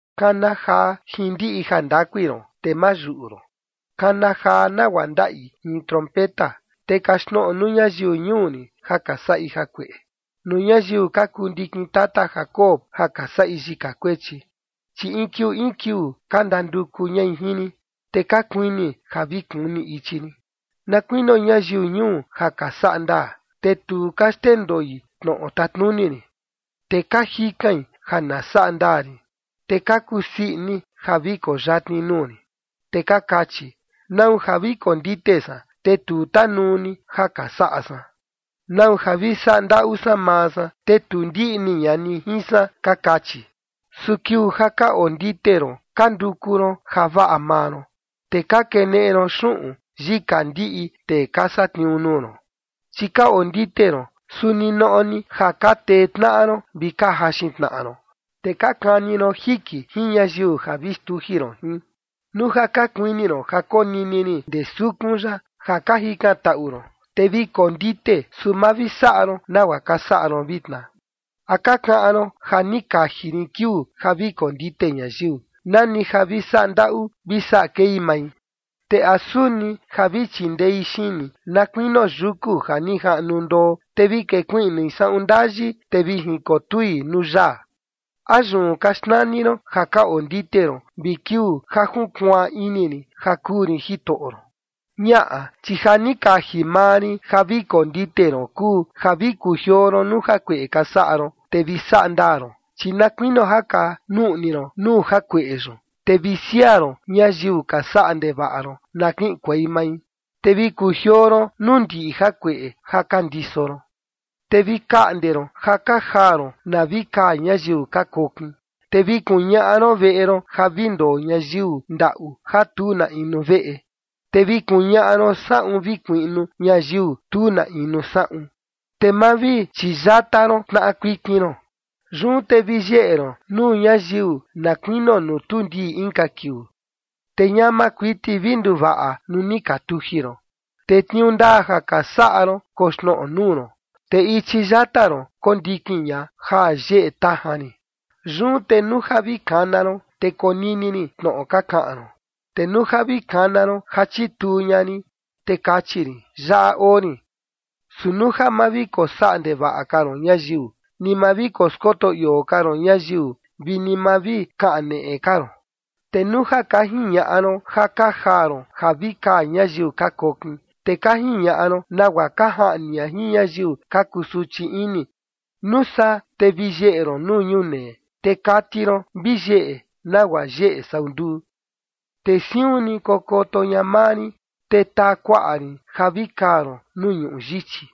“Kana jaa jin ndiꞌi jandakui ron, te ma yuꞌu ron. Kana jaa, nagua ndaꞌi in trompeta, te kaxtnoꞌo nuu ñayiu ñuu rin ja ka saꞌi jakueꞌe, nuu ñayiu ka kuu ndikin tata Jacob ja ka saꞌi yika kuechi. Chi in kiuu in kiuu ka ndanduku ñai jin rin, te ka kuini ja vi kuni ichi rin, na kuinio ñayiu ñuu ja ka saꞌa ndaa, te tu ka xndendoi tnoꞌo tatnuni rin, te ka jikain ja na saꞌa ndaa rin, te ka kusii ini ja vi koo yatni nuu rin. Te ka kachi: ¿Nau ja vi kondite san, te tu tanuu ni ja ka saꞌa san? ¿Nau ja vi saꞌa ndaꞌu san maa san, te tu ndiꞌni ña ni jin san?, ka kachi. Su kiuu ja ka ondite ron ka nduku ron javaꞌa maa ron, te ka keneꞌe ron xuꞌun yika ndiꞌi tee ka satniuu nuu ron. Chi ka ondite ron, su ninoꞌo ni ja ka tee tnaꞌa ron vi ka jaxin tnaꞌa ron. Te ka kani ron jiki jin ñayiu ja vi xtuji ron jin. Nuu ja ka kuini ron ja konini rin ndee sukun yaꞌa ja ka jikantaꞌu ron, te vi kondite, su ma vi saꞌa ron nagua ka saꞌa ron vitna. ¿A ka kaꞌan ron ja ni kaji rin kiuu ja vi kondite ñayiu, nani ja vi saꞌa ndaꞌu vi saꞌa kei mai? Te ¿a suni ja vi chindei xini, na kuinio yuku ja ni jaꞌnu ndoo te vi kekuiꞌnui saꞌun ndayi, te vi jinkotui nuu yaa? ¿A yun ka xnani ron ja ka ondite ron vi kiuu ja junkuaan ini rin ja kuu rin Jitoꞌo ron? Ñaꞌa, chi ja ni kaji maa rin ja vi kondite ron kuu ja vi kujioo ron nuu jakueꞌe ka saꞌa ron, te vi saꞌa ndaa ron, chi na kuinio ja ka nuꞌni ron nuu jakueꞌe yun. Te vi siaa ron ñayiu ka saꞌa ndevaꞌa ron na kiꞌinkuei mai, te vi kujioo ron nuu ndiꞌi jakueꞌe ja ka ndiso ron. Te vi kaꞌnde ron ja ka jaa ron na vi kaa ñayiu ka kokin, te vi kuñaꞌa ron veꞌe ron ja vi ndoo ñayiu ndaꞌu ja tu na inu veꞌe, te vi kuñaꞌa ron saꞌun vi kuiꞌnu ñayiu tu na inu saꞌun, te ma vi chiyata ron tnaꞌa kuikin ron. Yun te vi yeꞌe ron nuu ñayiu na kuinio nuu tuu ndii inka kiuu, te ñama kuiti vi nduvaꞌa nuu ni ka tuji ron, te tniuu ndaa ja ka saꞌa ron koxnoꞌo nuu ron, te ichi yata ron kondikin ña ja yeꞌe tajan rin. Yun te nuu ja vi kana ron, te konini rin tnoꞌo ka kaꞌan ron, te nuu ja vi kana ron ja chituu ña rin, te kachi rin: Yaꞌa oo rin. Su nuu ja ma vi kosaꞌa ndevaꞌa ka ron ñayiu, ni ma vi koskoto ioo ka ron ñayiu, vi ni ma vi kaneꞌe ka ron, te nuu ja ka jiñaꞌa ron ja ka jaa ron ja vi kaa ñayiu ka kokin, te ka jiñaꞌa ron nagua ka jaꞌni ña jin ñayiu ka kusuchi ini, nuu saa te vi yeꞌe ron nuu ñunee, te kati ron vi yeꞌe nagua yeꞌe sau nduu. Te siun ni kokoto ña maa rin, te taa kuaꞌa rin ja vi kaa ron nuu ñuꞌu yichi,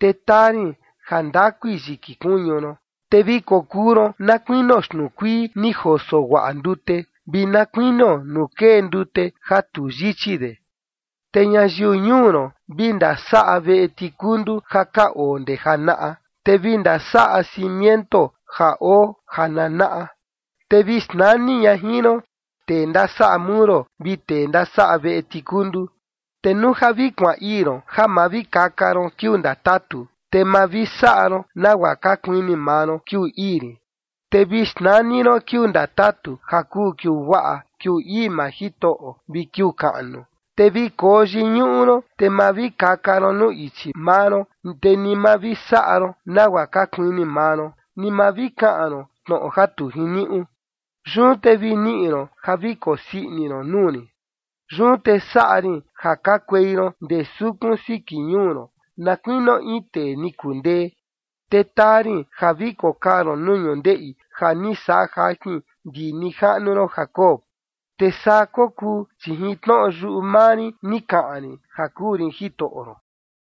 te taa rin jandakui yiki kuñu ron, te vi kokuu ron na kuinio xtnuu kuii ni joso guaꞌa ndute, vi na kuinio nuu kee ndute ja tu yichi de. Te ñayiu ñuu ron vi ndasaꞌa veꞌe tikundu ja ka oo ndee janaꞌa, te vi ndasaꞌa cimiento ja oo jananaꞌa, te vi xnani ña jin ron, ‘tee ndasaꞌa muro’ vi ‘tee ndasaꞌa veꞌe tikundu’. Te nuu ja vi kuaan ii ron ja ma vi kaka ron kiuu ndatatu, te ma vi saꞌa ron nagua ka kuini maa ron kiuu ii rin, te vi xnani ron kiuu ndatatu ja kuu kiuu guaꞌa, kiuu ii maa Jitoꞌo, vi kiuu kaꞌnu, te vi koyiñuꞌu ron, te ma vi kaka ron nuu ichi maa ron, ni ma vi saꞌa ron nagua ka kuini maa ron, ni ma vi kaꞌan ron tnoꞌo ja tu jiniuꞌu, yun te vi niꞌi ron ja vi kokusii ini ron nuu rin. Yun te saꞌa rin ja kakuei ron ndee sukun siki ñuu ron, na kuinio in tee ni kundee, te taa rin ja vi kokaa ron nuu ñundeꞌi ja ni saꞌa jajin ndi nijaꞌnu ron Jacob.” Te saa kokuu, chi jin tnoꞌo yuꞌu maa rin ni kaꞌan rin ja kuu rin Jitoꞌo ron.